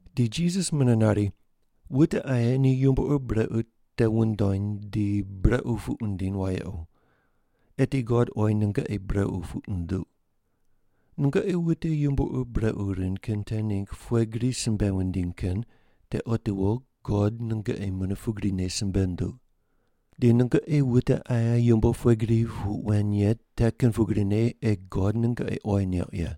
Di Jisas mune nari, “Wute aye ni yumbo ur brequ te wundony di brequ puq wundiny wayequ, eti God oyi nungoqi brequ puq nunduq. Nungoqi wute yumbo ur brequ rind kin te ningg pughe gri simbe wundiny kin te otiwo God nungoqi mune pugrine simbe nunduq, di nungoqi wute aye yumbo pughe gri pu weny ye te kin pugrine ei God nungoqi oyi neuq ye.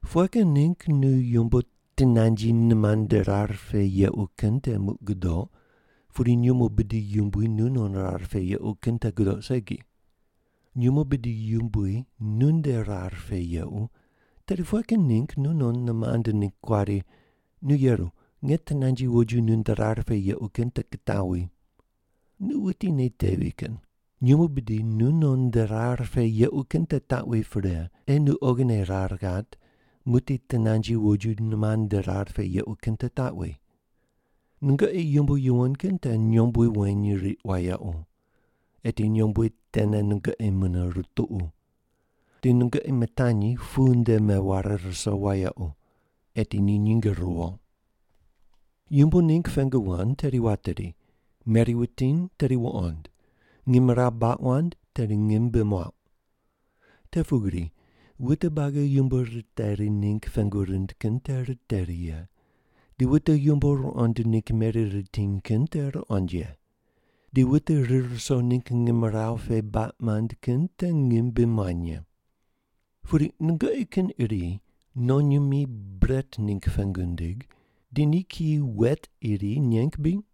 Pughe kin ningg nu yumbo tinanji nimand nde rar pe yequ kin te muq gudoq, pudi nyumo bidi yumbui nu non rar pe yequ kin te gudoq segi? Nyumo bidi yumbui nunde rar pe yequ, tedi pughe kin ningg nu non nimand ningg kuari, ‘Nu yeru, nge tinanji woju nunde rar pe yequ kin te kitaw wi?’ Nu wuti nei tevi kin! Nyumo bidi nu non nde rar pe yequ kin te taqwi pre, ei nu oghine rar ghat, muqdi tinanji woju nimand nde rar pe yequ kin te taqwi. “Nungoqi yumbo yuwon kin te nyombui weny riq wayequ. Eti nyombui tene nungoqi mune rutuqu. Di nungoqi mitani pu nde meware ruso wayequ. Eti ni nyinge ruwo.” “Yumbo ningg pengu wand tedi wateri, meri wutiny tedi wuqond, ngimrawu baq wand tedi ngim bi muauq. Te pugri wute buagi yumbo riteri ningg pengu rind kin te riteri ye, di wute yumbo ruqond ningg meri ritiny kin te ruqond ye, di wute rir ruso ningg ngimrawu pe baq mand kin te ngim bi muany ye. “Pudi nungoqi kin iri nonyimi bret ningg pengu nindig, di ni kiyi wet iri neng ye bri?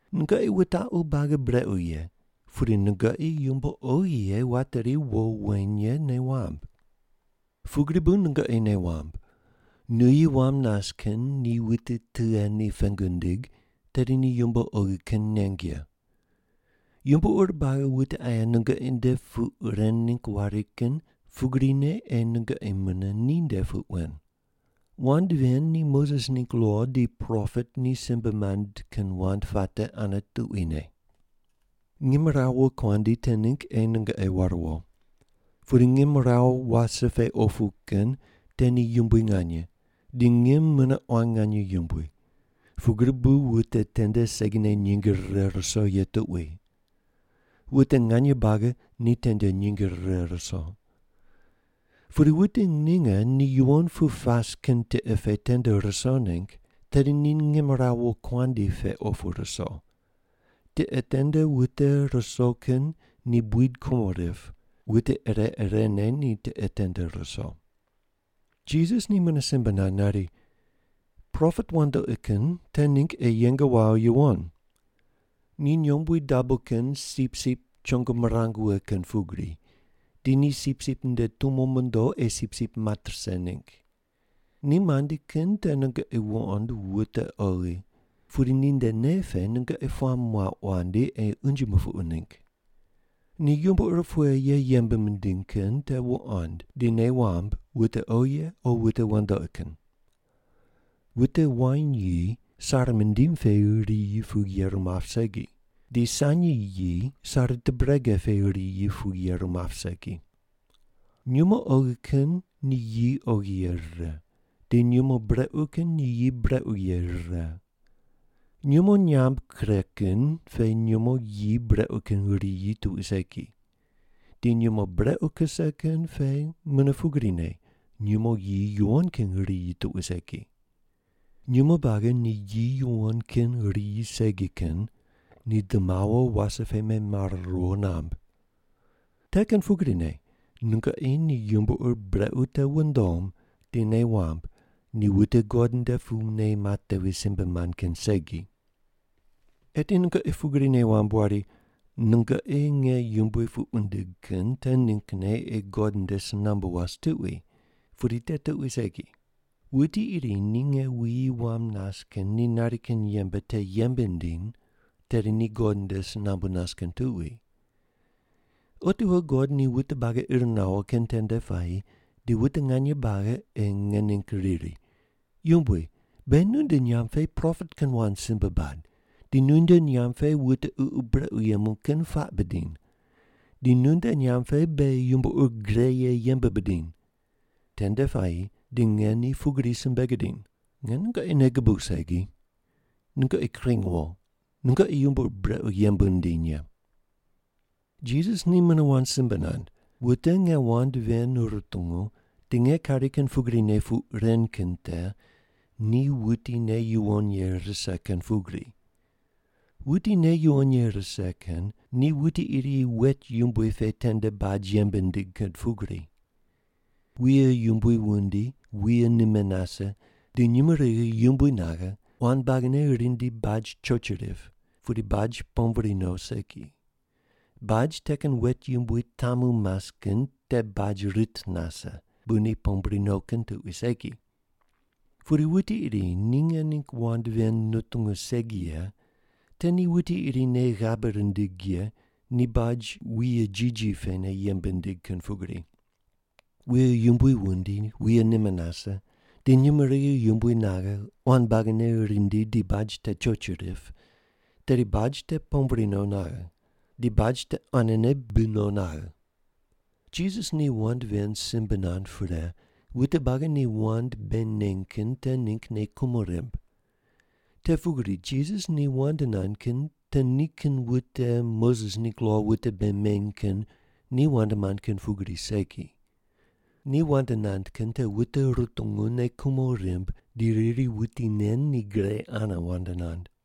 Nungoqi wutaqu buagi brequ ye, pudi nungoqi yumbo oghi ye wateri wo weny ye nei wamb. Pugri bu nungoqi nei wamb, nuyi wam nas kin ni wuti tughe ni pengu nindig, tedi ni yumbo oghi kin neng ye. Yumbo ur buagi wute aye nungoqi nde puq ren ningg wari kin pugrine ei nungoqi mune ninde puq wen. Wand ven ni Moses ningg lo di propet ni simbe mand kin wand puate ane tuquine.” “Ngimrawu wokuandi te ningg ei nungoqi war wo. Pudi ngimrawu wase pe opu kin te ni yumbui nganye, di ngim mune quan nganye yumbui, pugri bu wute tende segine nyinge rire ruso ye tuqui. Wute nganye buagi ni tende nyinge rire ruso. Pudi wute ninge ni yuwon pu pas kin tiqe pe tende ruso ningg, tedi ni ngimrawu wokuandi pe opu ruso. Tiqe tende wute ruso kin ni buid kumo rip, wute ire irene ni tiqe tende ruso.” Jisas ni mune simbe nand nari, “Propet wandoqi kin te ningg ei yeng wawo yuwon. Ni nyombui dabo kin sipsip chongo mirang wughe kin pugri, di ni sipsip nde tumo mondo ei sipsip mat rise ningg. Ni mandi kin te nungoqi wuqond wute oghi, pudi ninde nei pe nungoqi puamb muauq wandi, ei unje mupuqu ningg. Ni yumbo ur pughe ye yembe mindiny kin te wuqond di nei wamb wute oghi ye o wute wandoqi kin. Wute wain yi sare mundim pe riyi pu yeru map segi, di sanyi yi sare tubrege pe riyi pu yeru map segi. Nyumo oghi kin ni yi oghi ye rire, di nyumo brequ kin ni yi brequ ye rire. Nyumo nyam kure kin pe nyumo yi brequ kin riyi tuqui segi, di nyumo brequ kuse kin pe mune pugrine nyumo yi yuwon kin riyi tuqui segi. Nyumo buagi ni yi yuwon kin riyi segi kin ni di mawo wase pe memare riwo namb. Te kin pugrine nungoqi ni yumbo ur brequ te wundom di nei wamb ni wute God nde pu nei matevi simbe mand kin segi. “Eti nungoqi pugri nei wamb wari, nungoqi nge yumbui puq wundigh kin te ninggne ei God nde si nambu was tuqui, pudi te tuqui segi. Wuti iri ni nge wuyi wam nas kin ni nari kin yembe te yembe nindiny, tedi ni God nde si nambu nas kin tuqui. Otiwo God ni wute buagi ir nawo kin tende puayi di wute nganye buagi ei nge ningg riri, ‘Yumbui, beghi nunde nyamb pe propet kin wand simbe bad, di nunde nyamb pe wute ququ brequ yemu kin puaq bidiny, di nunde nyamb pe beghi yumbo ur gre ye yembe bidiny.’ Tende puayi di nge ni pugri simbe gidiny, ‘Nge nungoqi nei gubuq segi. Nungoqi kring wo, nungoqi yumbo ur brequ yembe wundiny ye.’” Jisas ni mune wand simbe nand, “Wute nge wand ven rutungu di nge kari kin pugrine puq ren kin te ni wuti nei yuwon ye rise kin pugri. Wuti nei yuwon ye rise kin ni wuti iri wet yumbui pe tende baj yembe nindig kin pugri. Wuye yumbui wundi, wuye nime nase, di nyumurighi yumbui naghe, quan buagine rindi baj choch rip, pudi baj pombri no segi. Baj te kin wet yumbui tamu mas kin te baj rit nase, bu ni pombri no kin tuqui segi. Pudi wuti iri ni nge ningg wand ven nutungu segi ye te ni wuti iri nei ghabe rindig ye ni baj wuye jiji pene yembe nindig kin pugri. Wuye yumbui wundi, wuye nime nase, di nyumurighi yumbui naghe, quan buagine rindi di baj te choch rip, tedi baj te pombri no naghe. Di baj te quanene bi no naghe.” Jisas ni wand ven simbe nand pre, wute buagi ni wand bei neny kin te ningg nei kumo rimb. Te pugri Jisas wand nand kin te nikin wute Moses ningg lo wute bei meny kin ni wand mand kin pugri segi. Ni wand nand kin te wute rutungu nei kumo rimb di riri wuti nen ni gre ane wand nand.